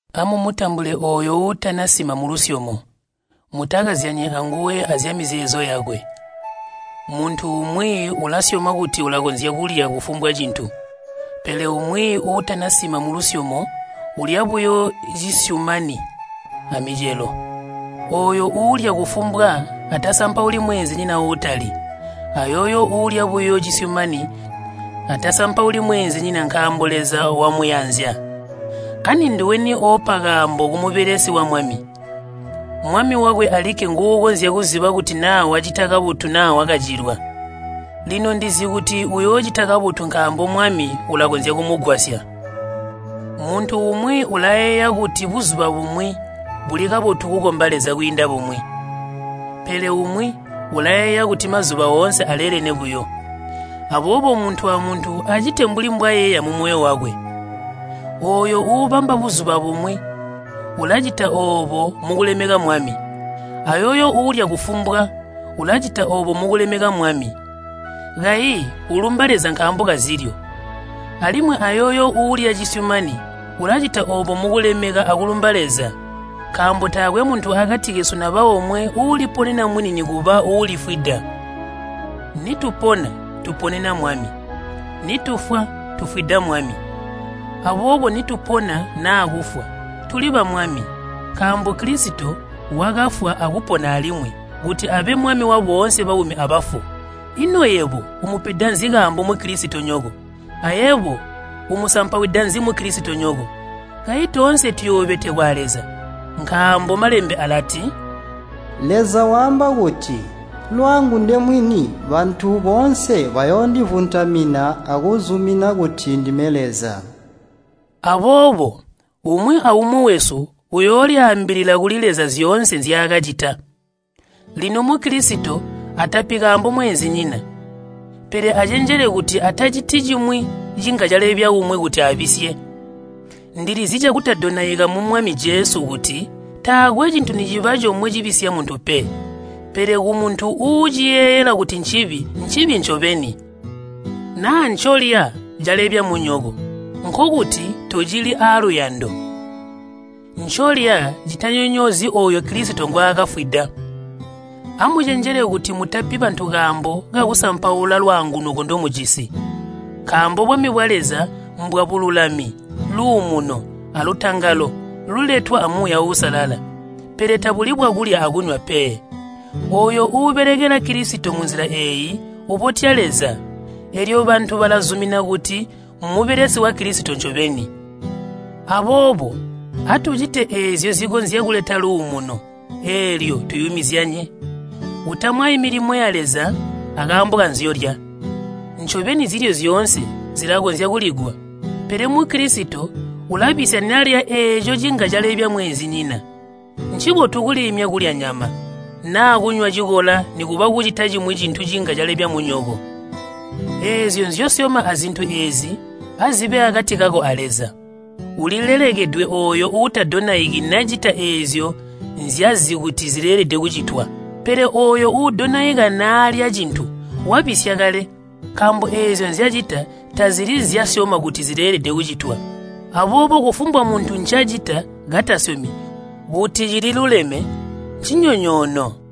Amumutambule ooyo uutanasima mulusyomo, mutakazyanyi anguwe azyamizeezo yakwe. Muntu umwi ulasyoma kuti ulakonzya kulya kufumbwa cintu. Pele umwi uutanasima mulusyomo ulya buyo cisyumani amicelo. Ooyo uulya kufumbwa atasampauli mweenzinyina uutalyi. Ayooyo uulya buyo cisyumani atasampauli mweenzinyina nkaambo Leza wamuyanzya. Ani nduweni oopa kaambo kumubelesi wa Mwami? Mwami wakwe alikke nguukonzya kuziba kuti naa wacita kabotu naa wakacilwa. Lino ndizi kuti uyoocita kabotu nkaambo Mwami ulakonzya kumugwasya. Muntu umwi ulayeeya kuti buzuba bumwi buli kabotu kukomba Leza kwiinda bumwi. Pele umwi ulayeeya kuti mazuba oonse aleelene buyo. Aboobo muntu amuntu acite mbuli mbwayeeya mumoyo wakwe. Ooyo uubamba buzuba bumwi ulacita oobo mukulemeka Mwami. Ayooyo uulya kufumbwa, ulacita oobo mukulemeka Mwami. Kayi ulumba Leza nkaambo kazilyo. Alimwi ayooyo uulya cisyumani, ulacita oobo mukulemeka akulumba Leza. Nkaambo taakwe muntu akati kesu naba omwe uuliponena mwini nikuba uulifwida. Nitupona, tuponena Mwami, nitufwa, tufwida Mwami. Aboobo nitupona naa kufwa, tuli ba Mwami. Nkaambo Kilisito wakafwa akupona alimwi kuti abe Mwami waboonse baumi abafu. Ino yebo umupeda nzi kaambo Mukilisitonyoko? Ayebo umusampawida nzi Mukilisitonyoko? Kayi toonse tuyoobetekwa a Leza. Nkaambo Malembe alati, “Leza waamba kuti, ‘Lwangu nde mwini, bantu boonse bayoondivuntamina akuzumina kuti ndime Leza.’” Aboobo umwi aumwi wesu uyoolyaambilila kuli Leza zyoonse nzyaakacita. Lino Mukilisito atapi kaambo mweenzinyina. Pele acenjele kuti ataciti cimwi cinga cilalebya umwi kuti abisye. Ndilizi cakutadonaika mu Mwami Jesu kuti taakwe cintu niciba comwe cibisya muntu pe. Pele kumuntu uuciyeeyela kuti ncibi, ncibi ncobeni. Naa ncolya calebya munyoko, nkokuti tocili aaluyando. Ncolya citanyonyoozyi ooyo Kilisito ngwaakafwida. Amucenjele kuti mutapi bantu kaambo kakusampaula lwaangunuko ndomujisi. Nkaambo bwami bwa Leza mbwabululami, luumuno alutangalo luletwa a Muuya Uusalala, pele tabuli bwakulya akunywa pe. Ooyo uubelekela Kilisito munzila eeyi, ubotya Leza, eelyo bantu balazumina kuti mmubelesi wa Kilisito ncobeni. Aboobo atucite eezyo zikonzya kuleta luumuno eelyo tuyumizyanye. Utamwayi milimo ya Leza akaambo kanzyolya. Ncobeni zilyo zyoonse zilakonzya kuligwa, pele Mukilisito ulabisya nalya eeco cinga calebya mweenzinyina. Ncibotu kuliimya kulya nyama, naa kunywa cikola nikuba kucita cimwi cintu cinga calebya munyoko. Eezyo nzyosyoma azintu eezi azibe akati kako a Leza. Ulilelekedwe ooyo uutadonaiki nacita eezyo nzyazi kuti zileelede kucitwa. Pele ooyo uudonaika naalya cintu wabisya kale, nkaambo eezyo nzyacita tazili nzyasyoma kuti zileelede kucitwa. Aboobo kufumbwa muntu ncacita katasyomi kuti cili luleme, ncinyonyoono.